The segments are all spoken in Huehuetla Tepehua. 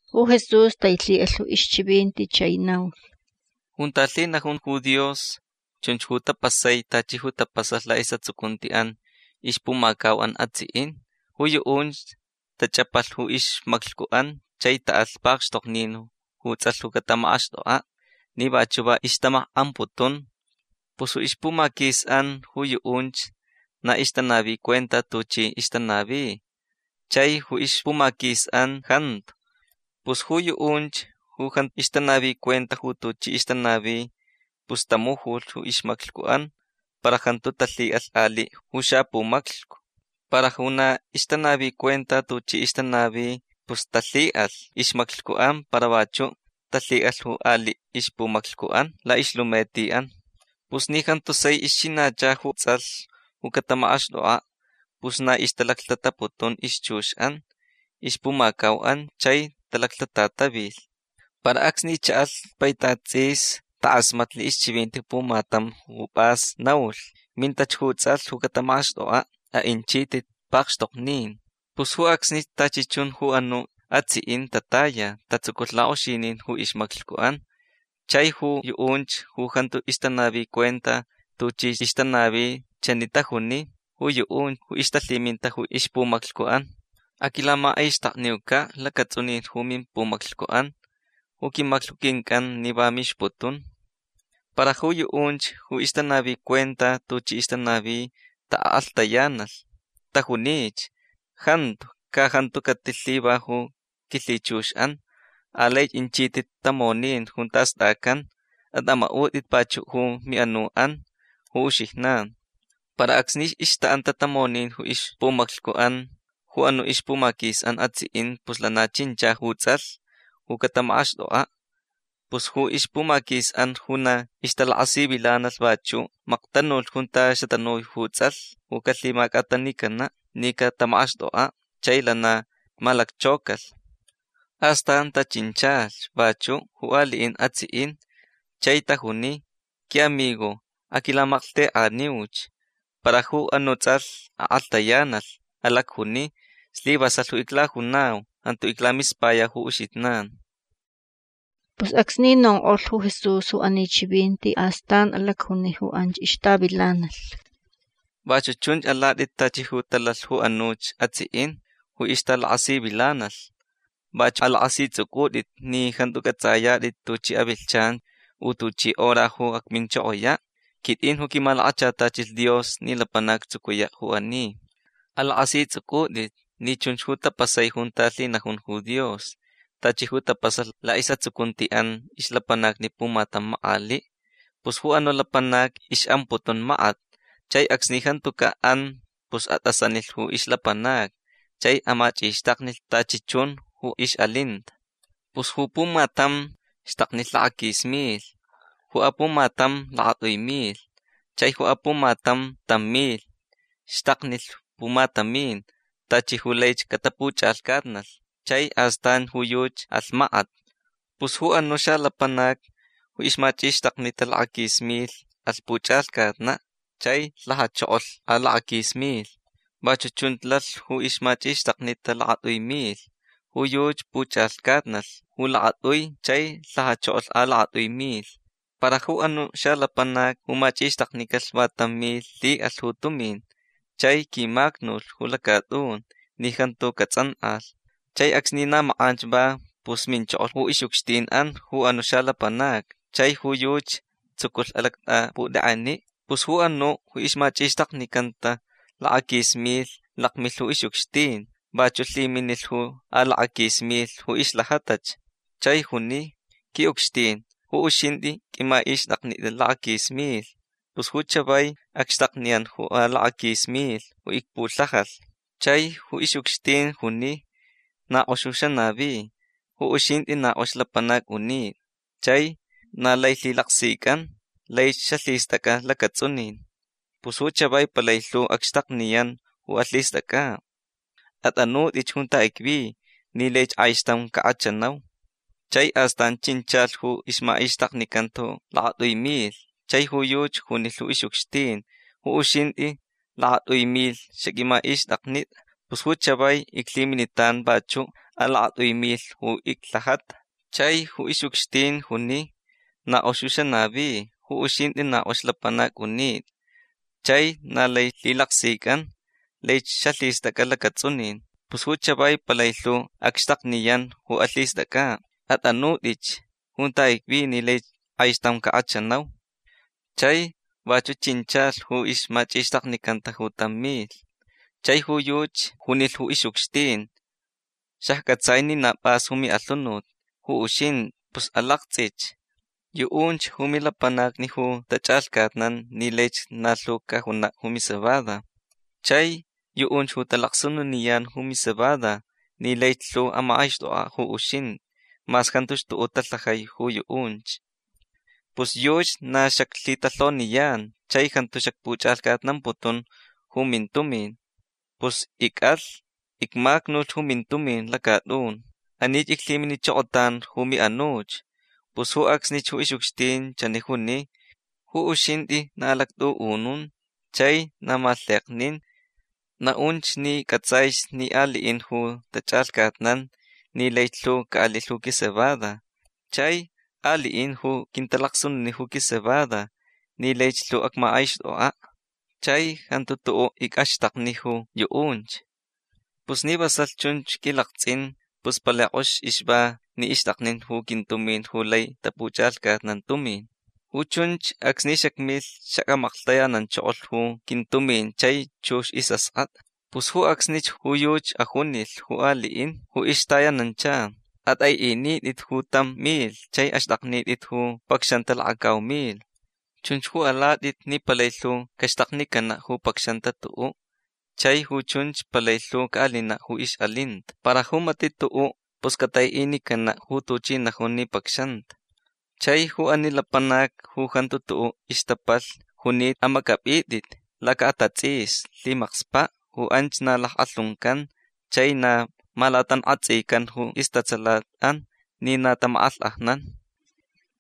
Ju Jesús tailhi'alh ju ixchivinti chai naulh: ―Junta lhinajun ju Dios chunch ju tapasai tachi ju tapasalh la'is'atsucunti'an ixpumacau'an atsi'in. Ju yu'unch tach'apalh ju ixmaclhcu'an chai ta'alh pakxtoknin ju ts'alh ju catamak'axt'ok'a' ni vachu' va ixtamak'amputun. Pus ixpumaquis'an ju yu'unch na ixtanavi cuenta tuchi ixtanavi. Chai ju ixpumaquis'an jantu. Pus ju yu'unch ju jantu ixtanavi cuenta ju tuchi ixtanavi pus tamujulh ju ixmaclhcu'an para jantu talhi'alh ali' ju xapumaclhcu. Para ju na ixtanavi cuenta tuchi ixtanavi pus talhi'alh ixmaclhcu'an para vachu' talhi'alh ali' ixpumaclhcu'an la'ixlumeti'an. Pus ni jantu sai ixchinacha ju ts'alh ju catamak'axt'ok'a' pus na ixtalaclhtataputun ixchux'an ixpumacau'an chai talaclhtatatavilh. Para acsni cha'alh paitat ts'is tak'asmatnilh ixchivinti ju pumatam ju p'as naulh: “Mintach ju ts'alh ju catamak'axt'ok'a'. A'inchit'it pakxtoknin”. Pus ju acsnich tachi chun ju anu' atsi'in tataya. Tatsuculh lak'oxinin ju ixmaclhcu'an. Chai ju yu'unch ju jantu ixtanavi cuenta tuchi ixtanavi chani tajuni ju yu'unch ju ixtalhiminta ju ixpumaclhcu'an: “Aquilamach'ixtakniuca' lacats'unin ju mimpumaclhcu'an. Ju quimaclhcu quinc'an ni va mixputun”. Para ju yu'unch ju ixtanavi cuenta tuchi ixtanavi ta'ak'alhtayanalh. Tajunich: “Jantu. Ca jantu catilhiva ju quilhichux'an. Alai inchit'it tamonin junta st'acan. At'ama'ut'it vachu' ju mi'anu'an ju uxijnan”. Para acsni ixta'anta tamonin ju ixpumaclhcu'an ju anu' ixpumaquis'an atsi'in pus lana chincha ju ts'alh ju catamak'axt'ok'a'. Pus ju ixpumaquis'an ju na ixtalakasivilanalh vachu' maktanulh junta xatanui ju ts'alh ju calhimac'atanicana' ni catamak'axt'ok'a'. Chai lana malacchaucalh. Astan tachinchalh vachu' ju ali'in atsi'in. Chai tajuni: “Qui'amigo aquilamalhtek'aniuch”. Para ju anu' ts'alh ak'alhtayanalh. Alacjuni: “Slivasalh ju iclajunau. Jantu iclamispayau ju uxijnan”. Pus acsni nonk'olh ju Jesús ju ani chivinti astan alacjuni ju anch ixtavilanalh: ―Vachu' chunch alat'it tachi ju talalh ju anuch atsi'in ju ixtalakasivilanalh. Vachu' alak'asits'uc'ut'it ni jantu c'ats'ayat'it tuchi avilhchan u tuchi hora ju acminchokoya'. Quit'in ju quimalakachatachilh Dios ni lapanac actsucuya' ju ani. Alak'asits'uc'ut'it ni chunch ju tapasai junta lhinajun ju Dios tachi ju tapasalh la'is'atsucunti'an ixlapanacni pumatam mak'ali'. Pus ju anu' lapanac ix'amputun makat. Chai acsni jantuca' an pus at'asanilh ju ixlapanacni chai amach'ixtaknilh tachi chun ju ix'alinta. Pus ju pumatam xtaknilh lakaquis milh. Ju apumatam lakat'ui milh. Chai ju apumatam tam milh. Xtaknilh pumatamin tachi ju laich catapuch'alhcatnalh. Chai astan ju yuchi alh makat. Pus ju anu' xalapanac ju ixmach'ixtaknita lakaquis milh alh puch'alhcatna' chai lhajachokolh alakaquis milh. Vachu' chunch lalh ju ixmach'ixtaknita lakat'ui milh. Ju yuchi puch'alhcatnalh ju lakat'ui chai lhajachokolh alakat'ui milh. Para ju anu' xalapanac ju mach'ixtaknicalh va tam milh lhi'alh ju tumin chai quimacnulh ju lacat'un ni jantu cats'ank'alh. Chai acsni na mak'anch va pus minchokolh ju ix'ucxtin'an ju anu' xalapanacni. Chai ju yuchi tsuculh alact'aput'ek'eni'. Pus ju anu' ju ixmach'ixtaknicanta lakaquis milh lakmilh ju ix'ucxtin. Vachu' lhiminilh ju alakaquis milh ju ixlhajatach. Chai juni: “Qui'ucxtin ju uxint'i q'uimach'ixt'aknit'a lakaquis milh. Pus ju chavai acxtakniyan ju alakaquis milh ju icpulhajalh”. Chai ju ix'ucxtin juni: “Na k'ox xanavi. Ju uxint'i na k'ox lapanac unit'a chai na lai lhilaksic'an. Laich xalhist'ac'a lacats'unin. Pus ju chavai palai lhu acxtakniyan ju alhist'ac'a'. At'anut'ich junta icvi ni laich k'aixtam cak'achanau”. Chai astan chinchalh ju ixmach'ixtaknicanta ju lakat'ui milh. Chai ju yuchi junilh ju ix'ucxtin: “Ju uxint'i lakat'ui milh xaq'uimach'ixt'aknit'a. Pus ju chavai iclhiminitan vachu' alakat'ui milh ju iclhajata”. Chai ju ix'ucxtin juni: “Na k'ox xanavi. Ju uxint'i na k'ox lapanac unit'a chai na lai lhilaksic'an. Laich xalhist'ac'a lacats'unin. Pus ju chavai palai lhu acxtakniyan ju alhist'ac'a'. At'anut'ich junta icvi ni laich k'aixtam cak'achanau”. Chai vachu' chinchalh ju ixmach'ixtaknicanta ju tam milh. Chai ju yuchi junilh ju ix'ucxtin: “Xacc'atsai ni na p'as ju mi'alhunut ju uxint'i. Pus alakts'ich. Yu'unch ju milapanacni ju tach'alhcatnan ni laich na lhu cajuna' ju micebada. Chai yu'unch ju talacsununiyan ju micebada ni laich lhu amak'aixt'ok'a' ju uxint'i mas jantuch tu'u' talhajai ju yu'unch. Pus yuchi na xaclhitalhoniyan chai jantu xacpuch'alhcatnamputun ju mintumin. Pus ic'alh. Icmacnulh ju mintumin lacat'un. Anich iclhiminichokotan ju mi'anuch”. Pus ju acsnich ju ix'ucxtin chani juni: “Ju uxint'i na alact'u'unun chai na malheknin. Na'unch ni c'ats'aich ni ali'in ju tach'alhcatnan ni laich lhu ca'alilh ju quicebada. Chai ali'in ju quintalacsununi ju quicebada ni laich lhu acmak'aixt'ok'a'. Chai jantu tu'u' ic'axtakni ju yu'unch. Pus ni vasalh chunch q'uilakts'in pus palai k'ox ixva ni ixt'aknin ju quintumin ju lai tapuch'alhcatnan tumin. Ju chunch acsni xacmilh xac'amaklhtayananchokolh ju quintumin chai chux ju is'ask'at'a”. Pus ju acsnich ju yuchi ajunilh ju ali'in ju ixtayanancha: “At'ai'init'it ju tam milh. Chai axt'aknit'it ju pacxanta lakacau milh. Chunch ju alat'it ni palai lhu caxtaknicana' ju pacxanta tu'u'. Chai ju chunch palai lhu ca'alina' ju ix'alinta. Para ju mati' tu'u' pus catai'inicana' ju tuchi najun ni pacxanta. Chai ju ani lapanac ju jantu tu'u' ixtapalhni junita amac'ap'it'it laca'atats'isni lhimakspa'. Ju anch na lack'alhuncan chai na malatank'atsican ju istatsalat'an ni na tamak'alhk'ajnan”.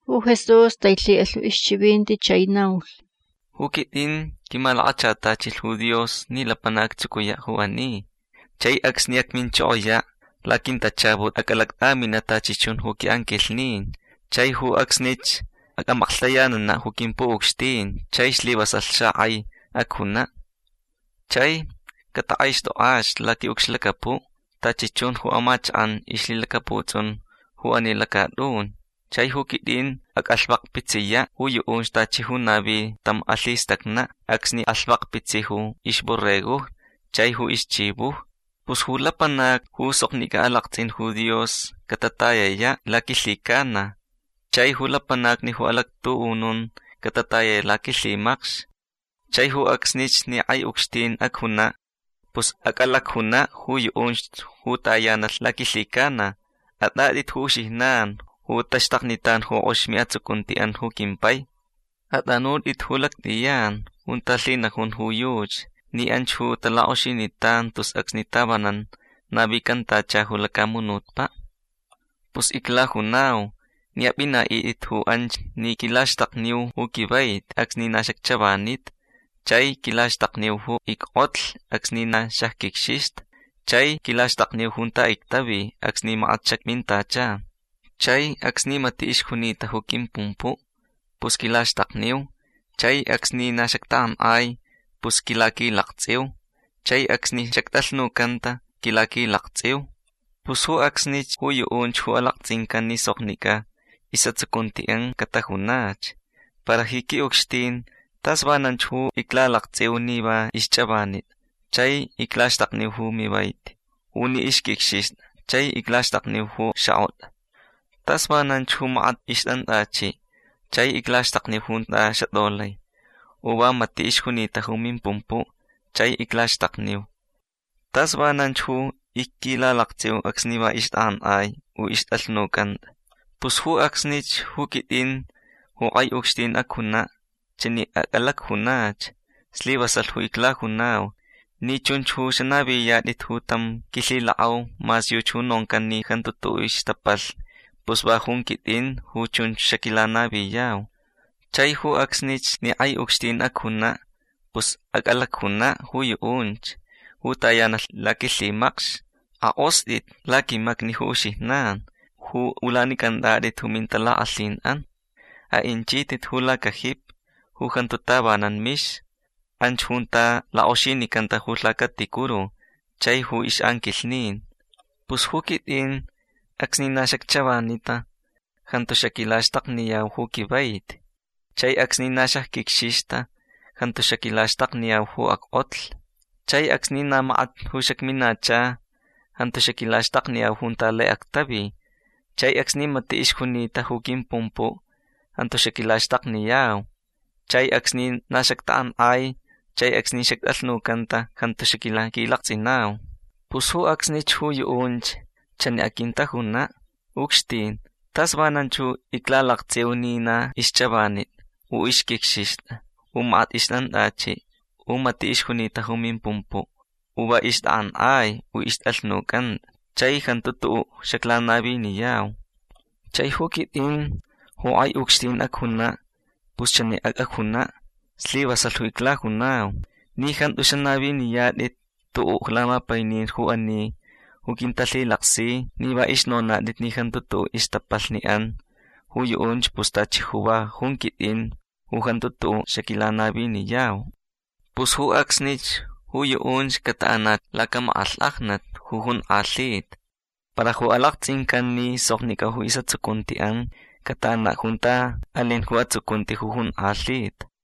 Ju Jesús tailhi'alh ju ixchivinti chai naulh: ―Ju quit'in quimalakachatachilh ju Dios ni lapanac actsucuya' ju ani. Chai acsni acminchokoya' laquintachaput ac'alact'amina' tachi chun ju qui'anquilhnin chai ju acsnich ac'amaklhtayanana' ju quimpu'ucxtin chai slivasalh xak'ai acjuna'. Chai catak'aixt'ok'ach laqui'ucxlacapu' tachi chun ju amachak'an ixlhilacaputs'un ju ani lacat'un. Chai ju quit'in ac'alhvakpitsiya' ju yu'unch tachi ju navi tam alhistacna' acsni alhvakpitsi ju ixborregojni chai ju ixchivojni. Pus ju lapanacni ju soknic'a alakts'in ju Dios catatayaya' laquilhicana. Chai ju lapanacni ju alactu'unun catatayaya' laquilhimacx. Chai ju acsnich ni k'ai ucxtin acjuna' pus ac'alacjuna' ju yu'unch ju tayanalh laquilhicana: “At'at'it ju uxijnan ju taxtaknitan ju k'ox mi'atsucunti'an ju quimpai. At'anut'it ju lact'iyan junta lhinajun ju yuchi ni anch ju talak'oxinitan tus acsni tavanan navicantacha ju lacamunutpa'. Pus iclajunau ni ap'ina'it'it ju anch ni quilaxtakniu ju quivaiti acsni na xacchavanita. Chai quilaxtakniu ju ick'otlh acsni na xacquicxixta. Chai quilaxtakniu junta ictavi acsni makat xacmintacha. Chai acsni mati' ixjunita ju quimpumpu' pus quilaxtakniu. Chai acsni na xactak'ank'ai pus quilaquilakts'iu. Chai acsni xact'alhnucanta quilaquilakts'iu”. Pus ju acsnich ju yu'unch ju alakts'incan ni soknic'a is'atsucunti'an catajunach: “Para ji qui'ucxtin tas vananch ju iclalakts'iu ni va ixch'avanit'a chai iclaxtakniu ju mivaiti. U ni ixq'uicxixt'a chai iclaxtakniu ju xak'ot'a. Tas vananch ju makat ixt'ant'achi' chai iclaxtakniu junta xatolai. U va mati' ixjunita ju mimpumpu' chai iclaxtakniu. Tas vananch ju icquilalakts'iu acsni va ixt'ak'ank'ai u ixt'alhnuc'ant'a”. Pus ju acsnich ju quit'in ju k'ai ucxtin acjuna' chani ac'alacjunach: “Slivasalh ju iclajunau. Ni chunch ju xanaviniyat'it ju tam quilhilak'au mas yuchi ju noncan ni jantu tu'u' ixtapalhni pus va jun quit'inch ju chunch xaquilanaviyau”. Chai ju acsnich ni k'ai ucxtin acjuna' pus ac'alacjuna' ju yu'unch ju tayanalh laquilhimacx: “Ak'ost'it laquimacni ju uxijnan ju ulanic'ant'at'it ju mintalak'alhin'an. A'inchit'it ju lacajipi ju jantu tavanan mix. Anch junta lak'oxinicanta ju lhacaticuru chai ju ix'anquilhnin. Pus ju quit'in acsni na xacchavanita jantu xaquilaxtakniyau ju quivaiti. Chai acsni na xacquicxixta jantu xaquilaxtakniyau ju ack'otlh. Chai acsni na makat ju xacminacha jantu xaquilaxtakniyau junta lai actavi. Chai acsni mati' ixjunita ju quimpumpu' jantu xaquilaxtakniyau. Chai acsni na xactak'ank'ai chai acsni xact'alhnucanta jantu xaquilaquilakts'inau”. Pus ju acsnich ju yu'unch chani aquintajuna': “Ucxtin tas vananch iclalakts'iu ni na ixch'avanit'a u ixq'uicxixt'a u makat ixt'ant'achi' u mati' ixjunita ju mimpumpu' u va ixt'ak'ank'ai u ixt'alhnuc'ant'a chai jantu tu'u' xaclanaviniyau”. Chai ju quit'in ju k'ai ucxtin acjuna' pus chani ac'ajuna': “Slivasalh ju iclajunau. Ni jantu xanaviniyat'it tu'u' lamapainin ju ani ju quintalhilaksi ni va ixnonat'it ni jantu tu'u' ixtapalhni'an ju yu'unch pus tachi ju va jun quit'in ju jantu tu'u' xaquilanaviniyau”. Pus ju acsnich ju yu'unch cata'anach lacamak'alhk'ajnat ju jonk'alhita. Para ju alakts'incan ni soknic'a ju is'atsucunti'an cata'ana' junta alin ju atsucunti ju jonk'alhita.